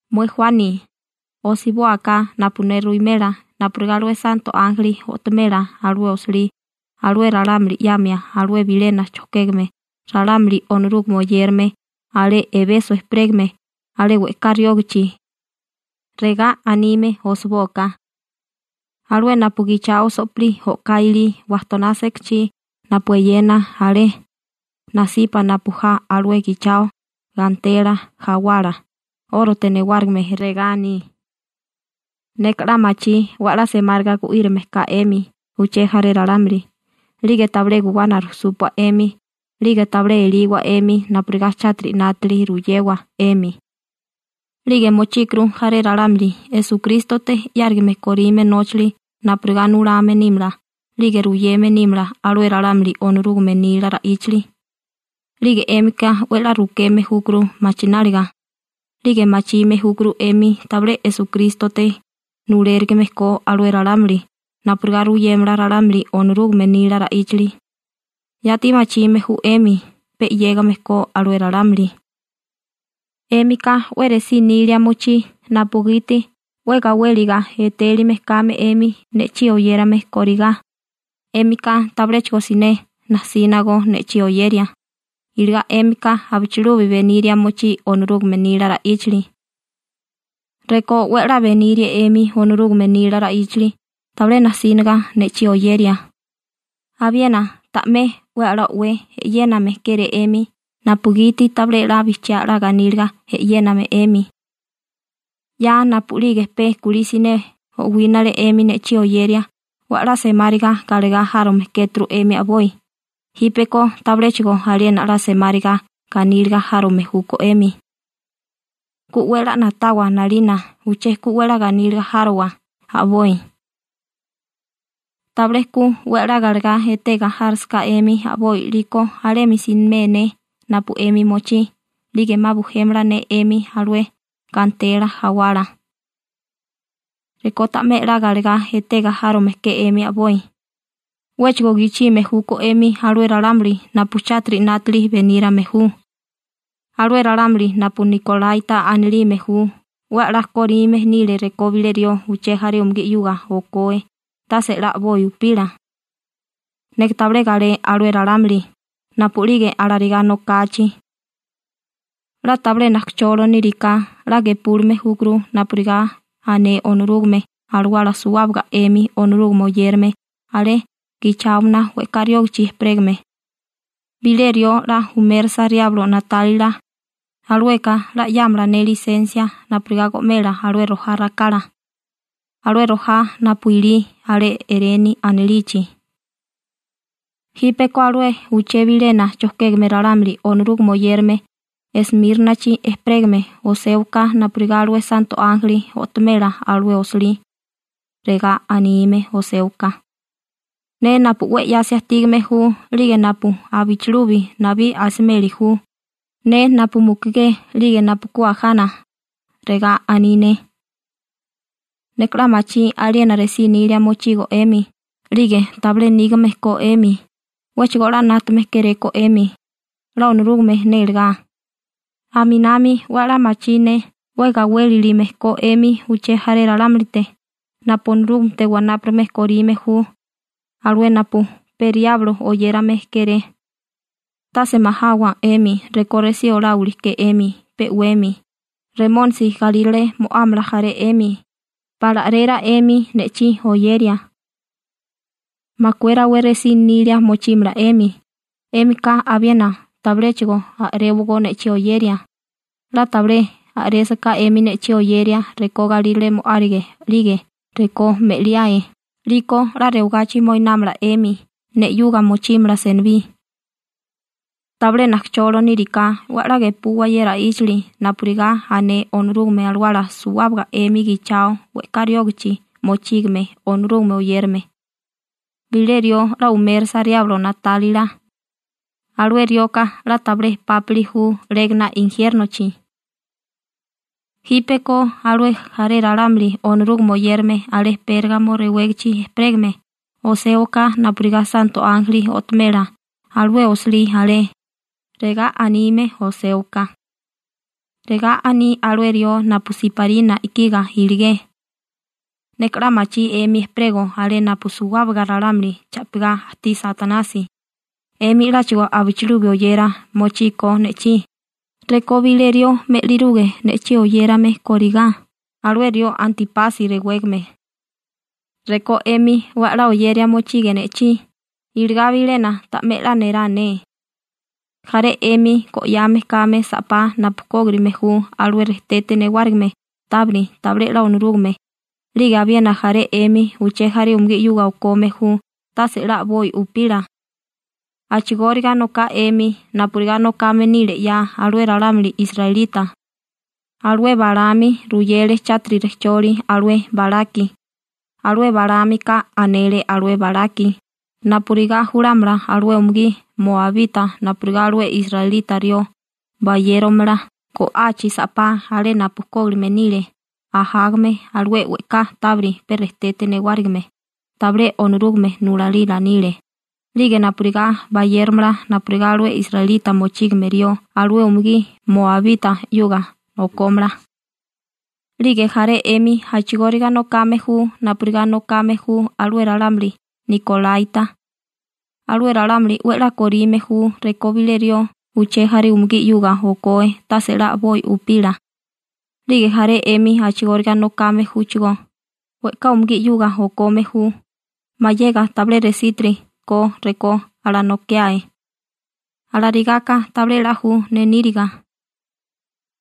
› Mué Juani, osibóaká napu ne ruwimela napurigá alué santo ánjeli o'tomela alué osilí alué ralámuli 'yamia alué bilena chojkégame ralámuli Onorúgame oyérame alé Ebeso ejperégame alé we'ká riógichi. Regá anime osibóaká: «Alué napu gichao so'pilí o'ká ilí wajtoná sekachí napu eyena alé nasipa napu ja alué gichao gantela jawala 'órote newárigime, regá aní: Neka 'la machí 'we 'la semáriga gu'írame ka 'emi uché jaré ralámuli, 'lige tabilé guwana rujsúpua 'emi 'lige tabilé eliwa 'emi napurigá chátiri 'nátili ruyewa 'emi, 'lige mochíkuru jaré ralámuli Esukrístote 'yárime korime nóchali napurigá nulame nímala 'lige ruyeme nímala alué ralámuli Onorúgame nila ra'íchali, 'lige 'émika 'we 'la rukeme júkuru machináliga, 'lige machime júkuru 'emi tabilé Esukrístote nulérigime ko alué ralámuli napurigá ruyémala ralámuli Onorúgame nila ra'íchali, yati machime ju 'emi pe 'yégame ko alué ralámuli. 'Émika 'we resí nilia mochí napugiti 'we gawéliga etélime kame 'emi ne'chí oyérame korigá, 'émika tabiléchigo siné najsina go ne'chí oyeria, iligá 'émika abichilubi beniria mochí Onorúgame nila ra'íchali. Rekó 'we 'la benirie 'emi Onorúgame nila ra'íchali tabilé najsínaga ne'chí oyeria, abiena ta'mé 'we 'la o'wé e'yéname kéré 'emi napugiti tabilé 'la bijchiá 'la ganíliga e'yéname 'emi. 'Ya napu'lige pe kulí siné o'wínale 'emi ne'chí oyeria 'we 'la semáriga galegá járome kéturu 'emi a'boi, jípeko tabiléchigo aliena 'la semáriga ganíliga járome júkó 'emi. Ku 'we 'la na'tawa 'nalina, uché ku 'we 'la ganíliga járowa a'boi. Tabilé ku 'we 'la galegá etega járisaká 'emi a'boi 'liko alemi simé ne napu 'emi mochí 'lige 'ma bujémala ne 'emi alué gantela jawala. Rekó ta'mé 'la galegá etega járome ke 'emi a'boi, 'wéchigo gichime júkó 'emi alué ralámuli napu chátiri 'nátili benírame ju. Alué ralámuli napu nikolaita anilime ju 'we 'la kóríme nile rekó bilé rió uché jaré umugí 'yuga okoe tase 'la a'boi upila. Neka tabilé galé alué ralámuli napu'lige alarigá nokachi. 'La tabilé najkacholo níriká 'la gepúlime júkuru napurigá ané Onorúgame Alawala suwábaga 'emi Onorúgame oyérame alé gicháomana we'ká riógichi ejperégame. Bilé rió 'la umérisa riablo na'tálila, alueka 'la 'yámala ne lisensia napurigá go'mela alué rojá rakala, alué rojá napu ilí alé Ereni anilichi.» › Jípeko alué uché bilena chojkégame ralámuli Onorúgame oyérame Esmírnachi ejperégame oséwaká napurigá alué santo ánjeli o'tomela alué osilí. Regá anime oséwaká: «Ne napu 'we 'yasi ajtígame ju 'lige napu abichilubi nabí asimeli ju, ne napu mukugé 'lige napu ku ajana, regá aní ne: Neka 'la machí aliena resí nilia mochigo 'emi, 'lige tabilé nígame ko 'emi, 'wéchigo 'la 'nátame kéréko 'emi, 'la Onorúgame nélegá. Aminami 'we 'la machí ne 'we gawélilime ko 'emi uché jaré ralámulite napu Onorúgamete wanápurigame korime ju alué napu pe riablo oyérame kéré. Tase majawa 'emi rekó resí oláwili ke 'emi pe 'wemi. Remónisi galírale mo'ámala jaré 'emi, pala a'rera 'emi ne'chí oyeria. Makué rawé resí nilia mochímala 'emi, 'émika abiena tabiléchigo a'réwagó ne'chí oyeria, 'la tabilé a'résaká 'emi ne'chí oyeria rekó galírale mo'árige 'lige rekó me'liae 'liko 'la rewagachi moinámala 'emi ne 'yuga mochímala senibí. Tabilé najkacholo níriká 'we 'la gepuwa ye ra'íchali napurigá ané Onorúgame Alawala suwábaga 'emi gichao we'ká riógichi mochígame Onorúgame oyérame. Bilé rió 'la umérisa Riablo na'tálila, alué rioka 'la tabilé pápili ju 'légana injiérnochi.» › Jípeko alué jaré ralámuli Onorúgame oyérame alé Pérgamo rewégichi ejperégame oséwaká napurigá santo ánjeli o'tomela alué osilí alé. Regá anime oséwaká: «Regá aní alué rió napu siparina i'kiga iligé: Neka 'la machí 'emi ejperego alé napu suwábaga ralámuli cha'pigá ajtí Satanasi, 'emi 'láchigo abichilubi oyera mochíkó ne'chí, rekó bilé rió me'liruge ne'chí oyérame kórigá, alué rió Antípasi rewégame. Rekó 'emi 'we 'la oyeria mochige ne'chí, iligá bilena ta'mé 'la nerá ne. Jaré 'emi go'yame kame sa'pá napu kógirime ju alué rejtete newárigime tábiri tabilé 'la Onorúgame 'lige abiena jaré 'emi uché jaré umugí 'yuga okome ju tase 'la a'boi upila. A'chigóriga noká 'emi napurigá nokame nile 'ya alué ralámuli israelita. Alué Balaámi ruyele chátiri rejcholi alué Balaki, alué Balaámika anele alué Balaki napurigá julámala alué umugí moabita napurigá alué israelita rió bayéromala go'achi sa'pá alé napu kógilime nile ajágame alué we'ká tábiri pe rejtete newárigime tabilé Onorúgame nulalila nile, 'lige napurigá bayéromala napurigá alué israelita mochígame rió alué umugí moabita 'yuga okómala. 'Lige jaré 'emi a'chigóriga nokame ju napurigá nokame ju alué ralámuli nikolaita. Alué ralámuli 'we 'la korime ju rekó bilé rió uché jaré umugí 'yuga okoe tase 'la a'boi upila. 'Lige jaré 'emi a'chigóriga nokame júchigó, we'ká umugí 'yuga okome ju, mayega tabilé resítiri ko rekó alanokae. Alarigáká tabilé 'la ju ne níriga.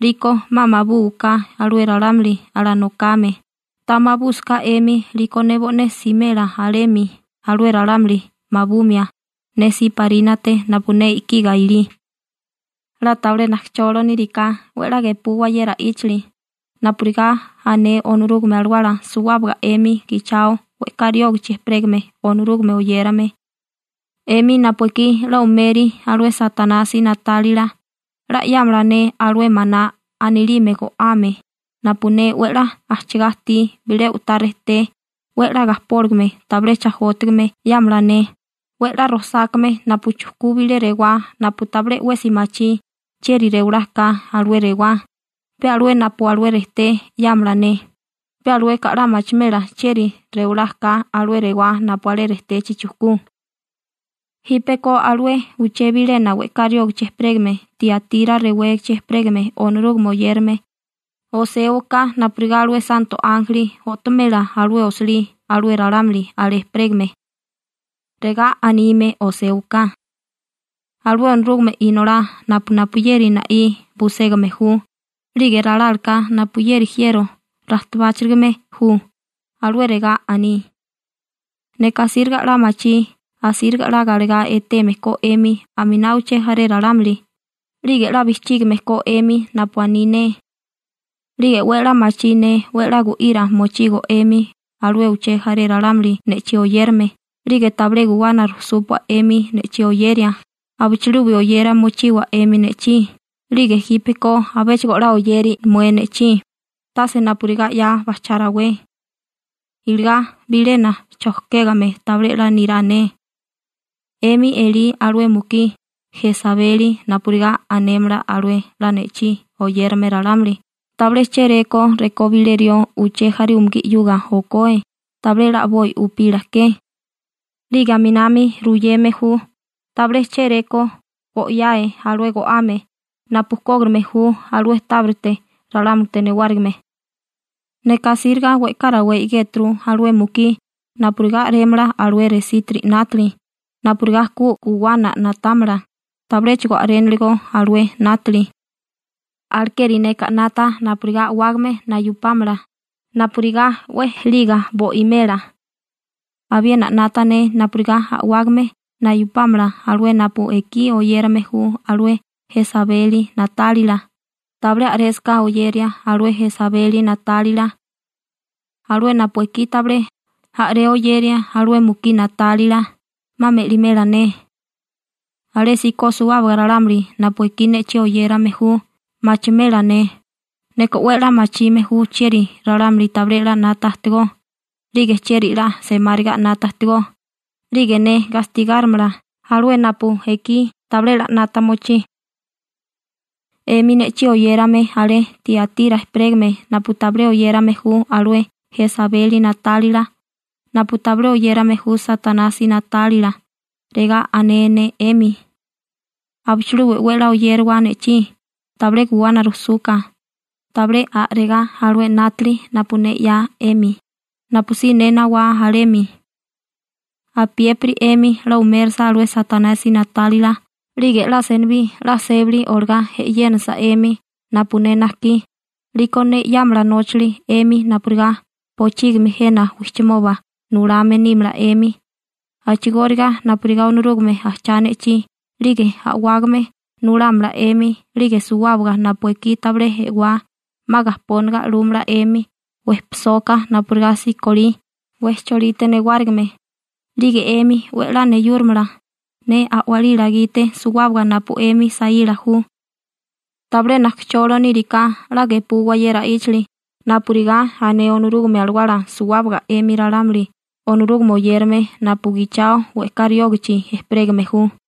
'Liko 'ma mabúwaká alué ralámuli alanokame, ta mabúsaká 'emi 'liko ne bo'né simela alemi alué ralámuli mabumia ne siparínate napu ne i'kiga ilí. 'La tabilé najkacholo níriká 'we 'la gepuwa ye ra'íchali napurigá ané Onorúgame Alawala suwábaga 'emi gichao we'ká riógichi ejperégame Onorúgame oyérame. 'Emi napu ekí 'la umeri alué Satanasi na'tálila 'la 'yámala ne alué maná anilime go'ame napu ne 'we 'la ajchigá ajtí bilé u'tá rejté 'we 'la gajpóligame tabilé chajótigame 'yámala ne, 'we 'la rojsákame napu chujkú bilé rewá napu tabilé 'wesi machí chieri rewalá ka alué rewá, pe alué napu alué rejté 'yámala ne, pe alueka 'la machimela chieri rewalá ka alué rewá napu alé rejtechi chukú.» › Jípeko alué uché bilena we'ká riógichi ejperégame Tiatira rewégichi ejperégame Onorúgame oyérame oséwaká napurigá alué santo ánjeli o'tomela alué osilí alué ralámuli alé ejperégame. Regá anime oséwaká: «Alué Onorúgame Inolá napu napuyeri na'í buségame ju, 'lige ralálaká napuyeri jiero rajtabáchirigame ju, alué regá aní: Neka asíriga 'la machí asíriga 'la galegá eteme ko 'emi aminá uché jaré ralámuli, 'lige 'la bijchígime ko 'emi napu aní ne. 'Lige 'we 'la machí ne 'we 'la gu'ira mochigo 'emi alué uché jaré ralámuli ne'chí oyérame, 'lige tabilé guwana rujsúpua 'emi ne'chí oyeria, abichilubi oyeria mochiwa 'emi ne'chí, 'lige jípeko abéchigo 'la oyeri mué ne'chí, tase napurigá 'ya bajchá rawé. Iligá bilena chojkégame tabilé 'la nirá ne. 'Emi elí alué mukí Jesabeli napurigá anémala alué 'la ne'chí oyérame ralámuli tabilé chéréko rekó bilé rió uché jaré umugí 'yuga okoe tabilé 'la a'boi upila ke. 'Lige aminami ruyeme ju tabilé chéréko go'yae alué go'ame napu kógirigame ju alué tábirite ralámulite newárigime. Neka asíriga we'ká rawé i'géturu alué mukí napurigá a'rémala alué resítiri 'nátili napurigá ku guwana na'támala, tabiléchigo a'réniligo alué 'nátili. Alekeri neka 'nata napurigá a'wágame nayupámala, napurigá 'we ejeliga bo'imela. Abiena 'nata ne napurigá a'wágame nayupámala alué napu ekí oyérame ju alué Jesabeli na'tálila, tabilé a'résaká oyeria alué Jesabeli na'tálila. Alué napu ekí tabilé a'ré oyeria alué mukí na'tálila, 'ma me'limela ne. Alésíko suwábaga ralámuli napu ekí ne'chí oyérame ju machimela ne, neka 'we 'la machime ju chieri ralámuli tabilé 'la 'nata ajtigó, 'lige chieri 'la semáriga 'nata ajtigó, 'lige ne gastigárimala alué napu ekí tabilé 'la 'nata mochí. 'Emi ne'chí oyérame alé Tiatira ejperégame napu tabilé oyérame ju alué Jesabeli na'tálila, napu tabilé oyérame ju Satanasi na'tálila, regá ané ne 'emi: Abichilubi 'we 'la oyériwa ne'chí, tabilé guwana rujsuka, tabilé a'regá alué 'nátali napu ne 'ya 'emi, napusí ne nawá alemi. Apiépiri 'emi 'la umérisa alué Satanasi na'tálila 'lige 'la senibí 'la sébali olagá e'yénasa 'emi napu ne najkí, 'liko ne 'yámala nóchali 'emi napurigá bochígimi jena wijchimoba nulame nímala 'emi, a'chigóriga napurigá Onorúgame ajchá ne'chí 'lige a'wágame nulámala 'emi 'lige suwábaga napu ekí tabilé e'wá 'ma gajpónaga 'lúmala 'emi wejpisóká napurigá sikolí wejcholite newárigime, 'lige 'emi 'we 'la neyúrimala ne a'walila gite suwábaga napu 'emi saíla ju. Tabilé najkacholo níriká 'la gepuwa ye ra'íchali napurigá ané Onorúgame Alawala suwábaga 'emi ralámuli Onorúgame oyérame napu gichao we'ká riógichi ejperégame ju.»